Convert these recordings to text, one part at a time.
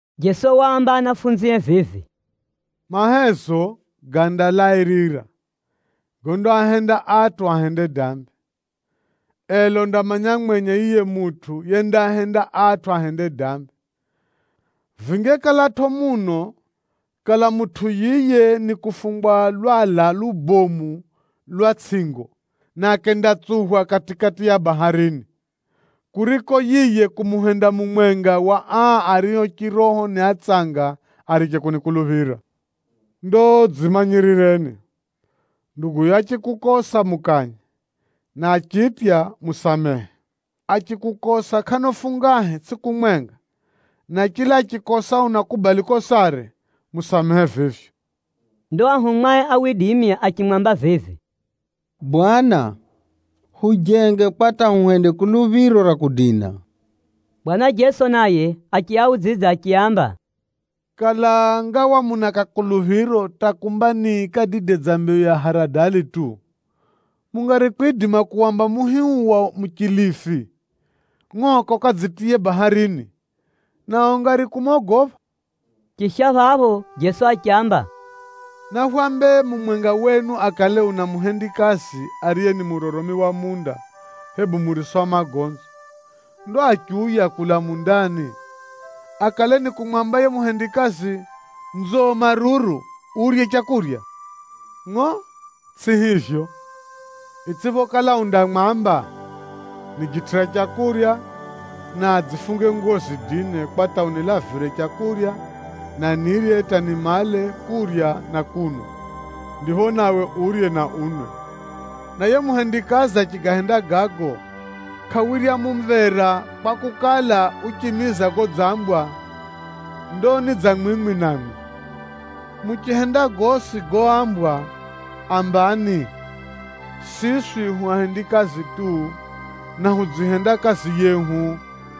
Jeso waamba anafunzie vivi, “Mahezo gandalairira gondaahenda atʼu ahende dambi, ela undamanya mwenye yiye mutʼu yendaahenda atʼu ahende dambi. Vingekalatʼo muno kala mutʼu yiye nikufungwa lwala lubomu lwa tsʼingo na akendatsuphwa kati-kati ya bahari, kuriko yiye kumuhenda mumwenga wa aa ario chiroho ni atsanga ariche kunikuluphira. Ndo dzimanyirireni! Nduguyo achikukosa mukanye, na achitya, musamehe. Achikukosa kʼano fungahe tsʼiku mwenga na chila achikosa unakubali kosare, musamehe vivyo.” Ndo anafunzie achimwamba vivi, “Bwana! Hujenge kwa hata huhende kuluphiro ra kudina.” Bwana Jeso naye achiaudzidza achiaamba, “Kala ngawa muna kakuluphiro hata kumba ni kadide dza mbeyu ya haradali tu, mungari kwidima kuwamba muhi uu wa muchilifi, ‘Ngʼoka ukadzitiye baharini,’ nao ungari kumogopha.” Chisha phapho Jeso achiamba, “Nahwambe mumwenga wenu akale una muhendikazi ariye ni muroromi wa munda, hebu murisa wa magonzi. Ndo achiuya kulaa mundani, akale nikumwamba yiye muhendikazi, ‘Nzo maruru, urye leu’? Ngʼo tsʼi hivyo! Itsʼiphokala undamwamba, ‘Nijitʼira leu na dzifunge nguwo zidine kwa hata unilavire leu na nirye hata nimale kurya na kunwa, ndipho nawe urye na unwe.’ Na yiye muhendikazi achigahenda gago, kʼawirya mumvera, kwakukala, uchimiza godzambwa. Ndo ni dza mwimwi namwi, muchihenda gosi goambwa, ambani, ‘Siswi hu ahendikazi tu, na hudzihenda kazi yehu.’”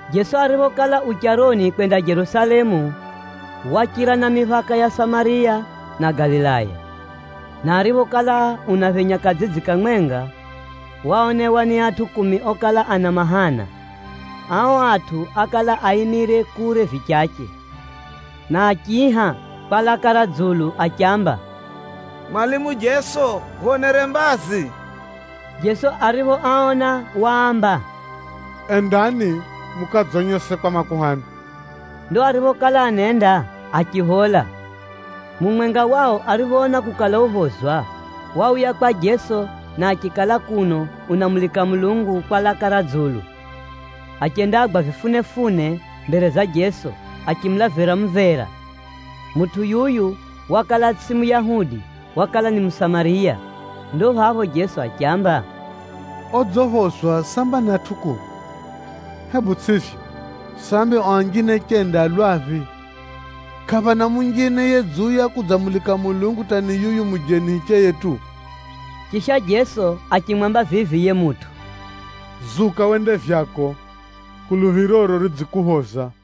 Jeso ariphokala u charoni kwenda Jerusalemu, wachira na miphaka ya Samariya na Galilaya. Na ariphokala unaphenya kadzidzi kamwenga, waonewa ni atʼu kumi okala ana mahana. Ao atʼu ákala aimire kure vichache, na achiiha kwa laka ra dzulu achiamba, “Mwalimu Jeso, hwonere mbazi.” Jeso ariphoaona waamba, “Endani mukadzonyese kwa makuhani.” Ndo ariphokala anenda, achiphola. Mumwenga wao ariphoona kukala uphozwa, wauya kwa Jeso na achikala kuno unamulika Mulungu kwa laka ra dzulu. Achendagwa vifunefune mbere za Jeso achimulavira mumvera. Mutʼu yuyu wakala tsʼiye Muyahudi wakala ni Musamariya. Ndo phapho Jeso achiamba, “Odziphozwa samba ni atʼu kumi, hebu tsʼivyo? Sambi ao anjine chenda a lwaphi? Kʼaphana munjine yedziuya kudzamulika Mulungu hata ni yuyu mujeni hicheye tu?” Chisha Jeso achimwamba vivi yiye mutʼu, “Zuka wende vyako, kuluphiroro ridzikuphoza.”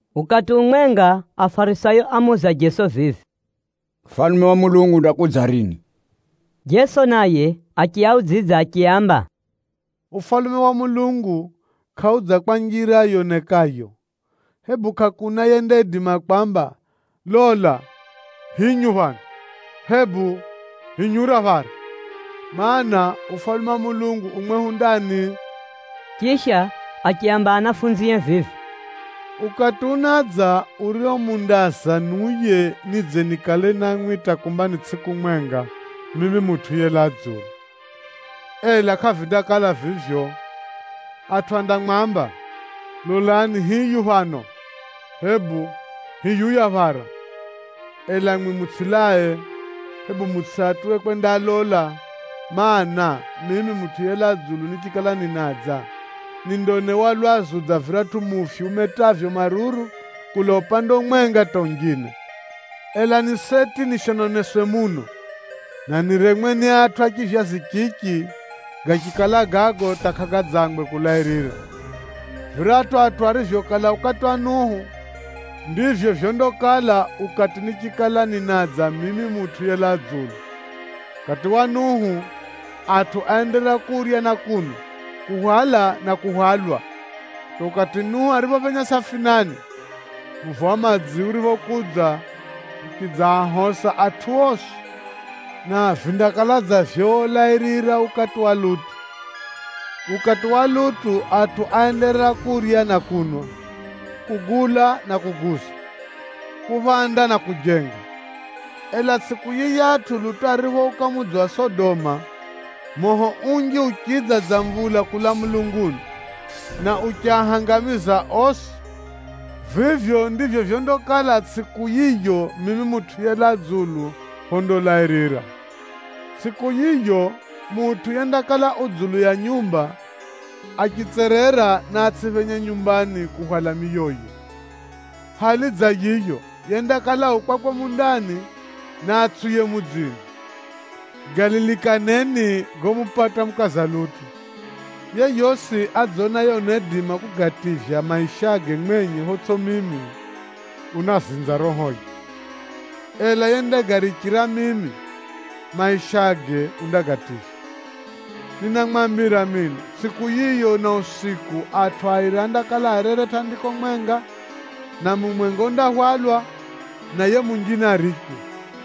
Ukati umwenga, Afarisayo ámuuza Jeso vivi, “Ufalume wa Mulungu undakudza rini?” Jeso naye achiaudzidza achiaamba, “Ufalume wa Mulungu kʼaudza kwa njira yonekayo. Hebu kʼakuna yendaidima kwamba, ‘Lola, hinyu phano,’ hebu ‘hinyura phara.’ Maana, Ufalume wa Mulungu u mwehu ndani.” Chisha achiaamba anafunzie vivi, “Ukati unadza urio mundaaza niuye nidze nikale namwi hata kumba ni tsʼiku mwenga mimi Mutʼu yelaa dzulu, ela kʼavindakala vivyo. Atʼu andamwamba, ‘Lolani hiyu phano,’ hebu ‘Hiyuya phara,’ ela mwimwi mutsʼilae, hebu mutsʼiatuwe kwendalola. Maana, mimi Mutʼu yelaa dzulu nichikala ninadza, nindaonewa lwazu dza viratʼu mufyu umetavyo maruru kulaa upande umwenga hata unjine. Ela ni seti nishononeswe muno, na niremwe ni atʼu a chivyazi chichi gachikala gago hata kʼagadzangwe kulairira. Viratʼu atʼu arivyokala ukati wa Nuhu, ndivyo vyondakala ukati nichikala ninadza mimi Mutʼu yelaa dzulu. Ukati wa Nuhu, atʼu áenderera kurya na kunwa, kuhwala na kuhwalwa hata ukati Nuhu ariphophenya safinani. Muvo wa madzi uriphokudza, uchidzaahosa atʼu osi. Na vindakala dza vyolairira ukati wa Lutu. Ukati wa Lutu atʼu áenderera kurya na kunwa, kugula na kuguza, kuphanda na kujenga. Ela tsʼiku yiyatʼu Lutu ariphouka mudzi wa Sodoma, moho unji uchidza dza mvula kulaa mulunguni, na uchiahangamiza osi. Vivyo ndivyo vyondakala tsʼiku yiyo mimi Mutʼu yelaa dzulu phondalairira. “Tsʼiku yiyo mutʼu yendakala u dzulu ya nyumba, achitserera naatsʼiphenye nyumbani kuhwala miyoye. Hali dza yiyo, yendakala u kwakwe mundani, naatsʼiuye mudzini. Galilikaneni gomupata mukaza Lutu. Yeyosi adzonaye unaidima kugativya maishage mwenye photsʼi mimi, unazinza rohoye, ela yendagarichira mimi maishage undagativya. Ninamwambira mino, tsʼiku yiyo na usiku atʼu airi andakala arere tʼandiko mwenga, na mumwenga undahwalwa, na yiye munjine arichwe.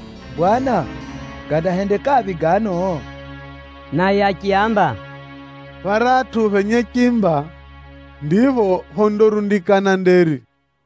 Phapho ao achimuuza vivi, “Bwana, gandahendekaphi gano?” Naye achiaamba, “Pharatʼu phenye chimba ndipho phondarundikana nderi.”